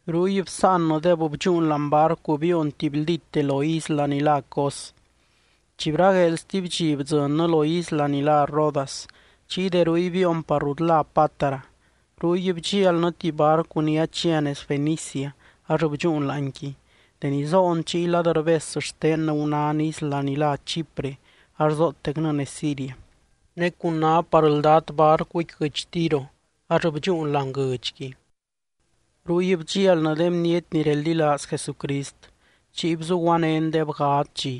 Ruy bsáannɨdeb, bdxúun láani barcu biion tibyldíte lo isla ni lá Cos. Chi bragueel stuby dxi bdzɨnnɨ lo isla ni lá Rodas, chiy de ruy biion par rut lá Pátara. Ruy bdxialnɨ tuby barcu ni achia nez Fenicia, ax bdxúun láanqui. Deni zoon chiy lad rbes xtennɨ gunán isla ni lá Chipre, ax zootecnɨ nez Siria. Ne cun ná par ldat barcuqui guɨdx Tiro, ax bdxúun láani guɨdxqui. Ruy bdxialnɨ de bniety ni reldilaaz Jesucrist, chiy bzuguanéndeb gadz dxi.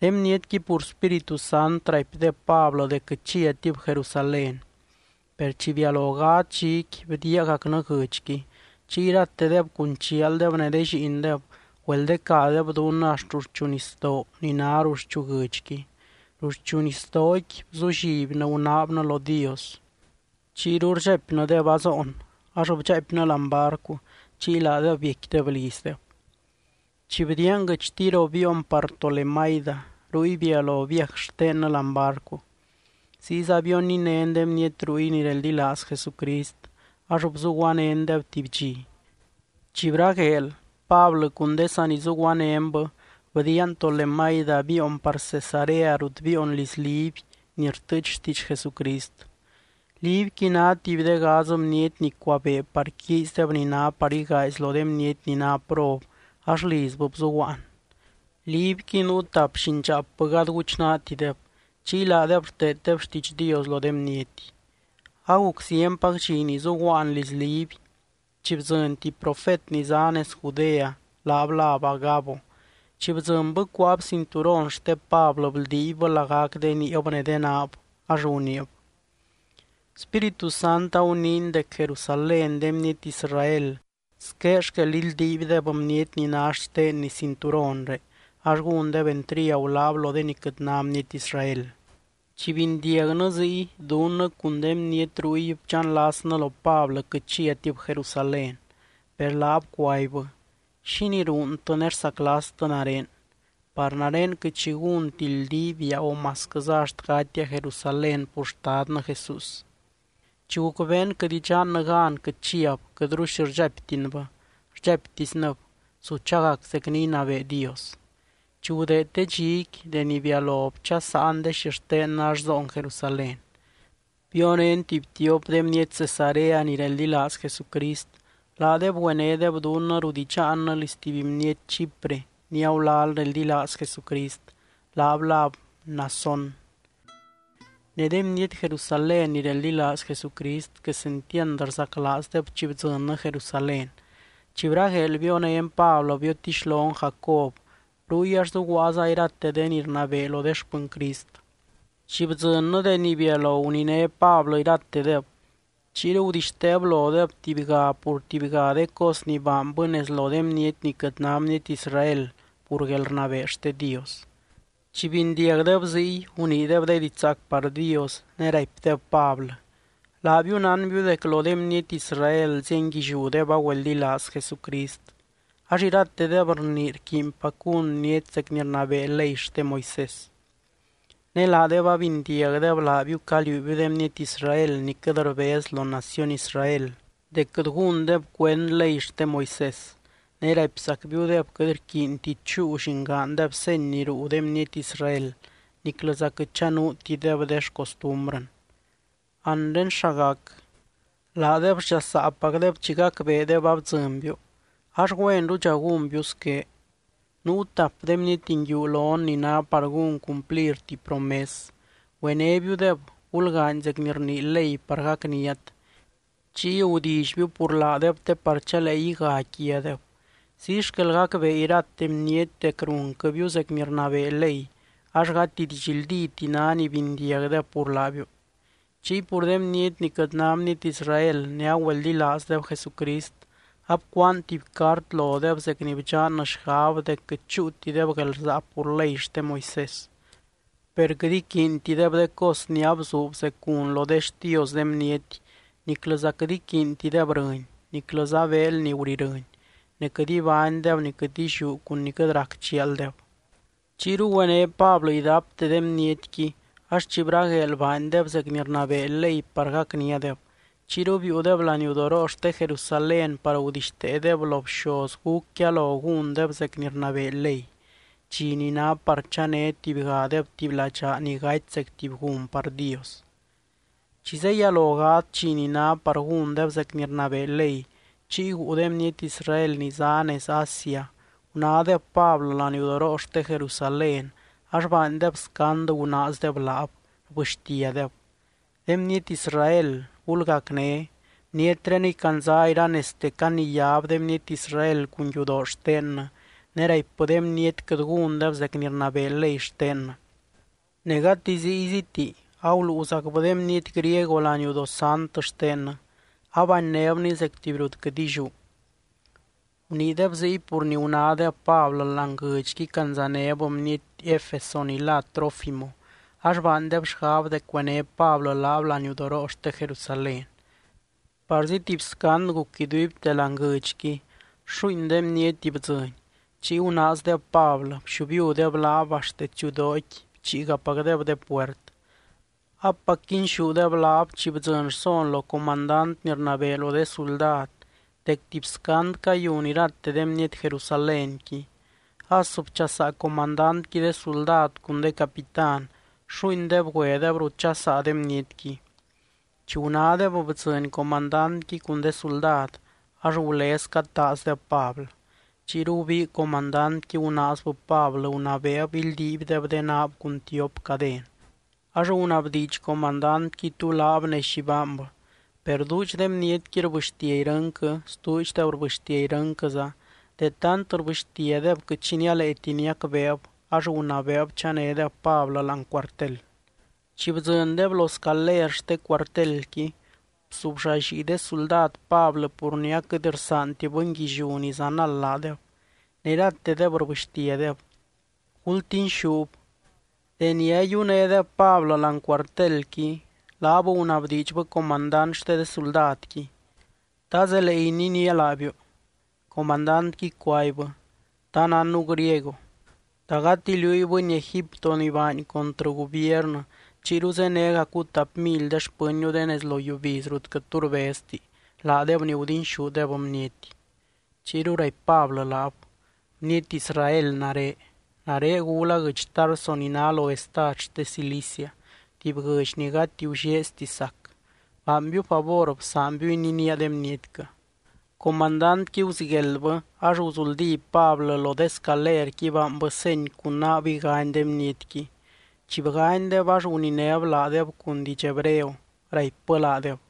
De bnietqui pur Spíritu Sant, raipdeb Pablɨ dec quɨt chiatib Jerusalén. Per chi bialo gadz dxiqui, bdiiagacnɨ guɨdxqui. Chiy iratedeb cun chialdeb ne de lliindeb, güeldecadeb dunnɨ axt ruxchu nisdoo ni ná ruxchu guɨdxqui. Ruxchu nisdooqui bzullibnɨ gunaabnɨ lo Dios, chiyru rdxaipnɨdeb azoon ax bdxaaipnɨ láani barcu, chiy laadeb biecquideb lizdeb. Chi bdiian guɨdx Tiro biion par Tolemaida, ruy bialo viaj xtennɨ láani barcu. Ziyza bioninén de bniety ruy ni reldilaaz Jesucrist, ax bzuguanéndeb tuby dxi. Chi bragueel, Pablɨ cun de sanizuguanénbɨ bdiian Tolemaida biion par Cesarea rut biion liz Liby ni rtɨɨch xtiidx Jesucrist. Libyqui ná tuby de gadz bniety ni cuabee par quiizdeb ni ná par igaazy lo de bniety ni ná prob, ax lizbɨ bzuguaan. Libyqui nuu tap llindxaapbɨ gady guchnaatideb, chiy laadeb rteeddeb xtiidx Dios lo de bniety. Aguc zienpac dxi ni zuguaan liz Liby, chi bdzɨny tuby profet ni zá nez Judea, laab láb Agabo. Chi bdzɨnbɨ cuáab cinturon xte Pablɨ bldiibbɨ lagac de niib ne de naab, ax guniib: —Spíritu Sant aguniiny dec Jerusalén de bniety Israel squé xquel ildiibdeb bniety ni ná xtenni cinturonré, ax gúndeb entriagu laab lo de ni quɨt ná bniety Israel. Chi bindiagnɨ ziy, dunnɨ cun de bniety ruy bdxanlasnɨ lo Pablɨ quɨt chiatib Jerusalén. Per laab cuaibbɨ: —¿Xínii ruuntɨ ne rsaclastɨ nare? Par nare quɨt xi gúnti ldiibia, o masquɨza axt gatia Jerusalén pur Xtadnɨ Jesús. Chi gucbeen quɨt idxannɨ gan quɨt chiab, quɨtru xi rdxaiptinbɨ, rdxaiptisnɨb: —Su chagac zec ni inabee Dios. Chi gudeed de dxiqui, deni bialo bchasaan de xixtennɨ ax zoon Jerusalén. Bionén tuby tiop de bniety Cesarea ni reldilaaz Jesucrist, laadeb güenédeb dunnɨ rut idxaannɨ liz tuby bniety Chipre ni agulal reldilaaz Jesucrist, laab láb Mnasón. Ne de bniety Jerusalén ni reldilaaz Jesucrist, quesentiand rzaclaazdeb chi bdzɨnnɨ Jerusalén. Chi bragueel bionén Pablɨ biotixlon Jacob, ruy ax zuguaaza irate de ni rnabee lo de xpɨny Crist. Chi bdzɨnnɨ deni bialo guniné Pablɨ iratedeb, chiyru gudixteeb lodeb tubyga pur tubyga de cos ni baanbɨ nez lo de bniety ni quɨt ná bniety Israel, pur guelrnabee xte Dios. Chi bindiagdeb ziy, guniideb de diidx zaac par Dios, ne raipdeb Pablɨ: —Laabiu nánbiu dec lo de bniety Israel zienguilliúdeb agüeldilaaz Jesucrist, ax iratedeb rnii rquiinpac gún bniety zec ni rnabee ley xte Moisés. Ne laadeb abindiagdeb laabiu caliuubiu de bniety Israel ni quɨt rbez lo naciony Israel dec quɨt gúndeb cuend ley xte Moisés, ne raipzacbiudeb quɨt rquiinti chúu llingaandeb seny ni ruu de bniety Israel niclɨza quɨt chanuutideb de xcostumbrɨn. Anre, ¿xa gac? Laadeb sdxasaapacdeb chi gacbeedeb abdzɨnbiu. Ax güenrudxa gúnbiu squé: Nuu tap de bniety nguiu lon ni ná par gún cumplir tuby promes. Güenébiudeb, gulgaany zec ni rnii ley par gacniat, chiy gudillybiu pur laadeb te par chalee iga quiadeb. Ziy xquel gacbee irate bniety dec runquɨbiu zec ni rnabee ley, ax gati didxldíti ná ni bindiagdeb pur laabiu. Chiy pur de bniety ni quɨt ná bniety Israel ne agüeldilaazdeb Jesucrist, abcuaan tuby cart lodeb zec ni bdxannɨ xgab dec quɨt chúutideb guelrsaa pur ley xte Moisés. Per quɨt iquiintideb de cos ni abzuub zec gun lo de xtios de bniety, niclɨza quɨt iquiintideb rɨny, niclɨza beel ni gurirɨny, ne quɨt ibánydeb ni quɨt illiú cun ni quɨt rac chialdeb. Chiyru güené Pablɨ idapte de bnietqui, ax chi bragueel baandeb zec ni rnabee ley par gacniadeb. Chiyru biiudeb laniudoroo xte Jerusalén par gudixteedeb lo bxoz gúc yalo gúndeb zec ni rnabee ley, dxi ni ná par chané tubygadeb tuby ladxaa ni gaty zec tuby gun par Dios. Chi zeyalo gadz dxi ni ná par gúndeb zec ni rnabee ley, chiy guu de bniety Israel ni zá nez Asia gunádeb Pablɨ laniudoroo xte Jerusalén, ax baandeb scand gunaazdeb laab, rbɨxtiadeb: —¡De bniety Israel, gulgacné! Bnietreniy candza iranezte caniyáb de bniety Israel cun yudoo xtennɨ, ne raipbɨ de bniety quɨt gúndeb zec ni rnabee ley xtennɨ. Ne gati zíyziti, aguluuzacbɨ de bniety griego laniudoo sant xtennɨ, abannébny zec tuby rut quɨt illiú. Guniideb ziy pur ni gunádeb Pablɨ láani guɨdxqui candzanéb bniety Efeso ni lá Trófimo, ax baandeb xgab dec güené Pablɨ laab laniudoroo xte Jerusalén. Parzi tuby scand guc iduibte láani guɨdxqui, xuuin de bniety bdzɨny. Chiy gunaazdeb Pablɨ, bxiubiudeb laab axt detsiudooqui bchiigapacdeb de puert. Apac quinxúdeb laab, chi bdzɨny rson lo comandant ni rnabee lo de suldad dec tuby scand cayun irate de bniety Jerusalénqui. As bchasaa comandantqui de suldad cun de capitán, xuuindeb güedeb rut dxasaa de bnietqui. Chi gunádeb bdzɨny comandantqui cun de suldad, ax gulez cataazdeb Pablɨ. Chiyru gubii comandantqui, gunaazbɨ Pablɨ gunabeeb ildiibdeb de naab cun tiop caden. Ax gunabdiidx comandantqui tú laab, ne xi baanbɨ. Per duudx de bnietqui rbɨxtia irɨnquɨ, stuudxdeb rbɨxtia irɨnquɨza, de tant rbɨxtiadeb quɨt xi nialeeti niacbeeb ax gunabeeb chanédeb Pablɨ láani cuartel. Chi bdzɨndeb lo de scaler xte cuartelqui, bzubllallii de suldad Pablɨ pur ni aquɨt rsaanti bɨnguilliú ni zanald laadeb, ne iratedeb rbɨxtiadeb: —¡Gultinxúb! Deni ayiunédeb Pablɨ láani cuartelqui, laab gunabdiidxbɨ comandant xte de suldadqui: —¿Ta zelee ininía laabiu? Comandantqui cuaibbɨ: —¿Ta nánnu griego? ¿Ta gati liúy bɨny Egipto ni baany contrɨ gubiernɨ, chiyru zénegacu tap mily de xpɨnniu de nez lo yiubiz rut quɨt tu rbezti, laadeb ni gudinxúdeb bniety? Chiyru raipy Pablɨ laab: —Bniety Israel nare. Nare gula guɨdx Tarso ni ná lo estad xte Cilicia, tuby guɨdx ni gati gullieezti sac. Baanbiu favor bsaanbiu ininía de bnietquɨ. Comandantqui guzigueldbɨ, ax guzuldí Pablɨ lo de scalerqui baanbɨ seny cun naab igany de bnietqui. Chi bganydeb, ax guninéb laadeb cun diidx hebreo, raipbɨ laadeb: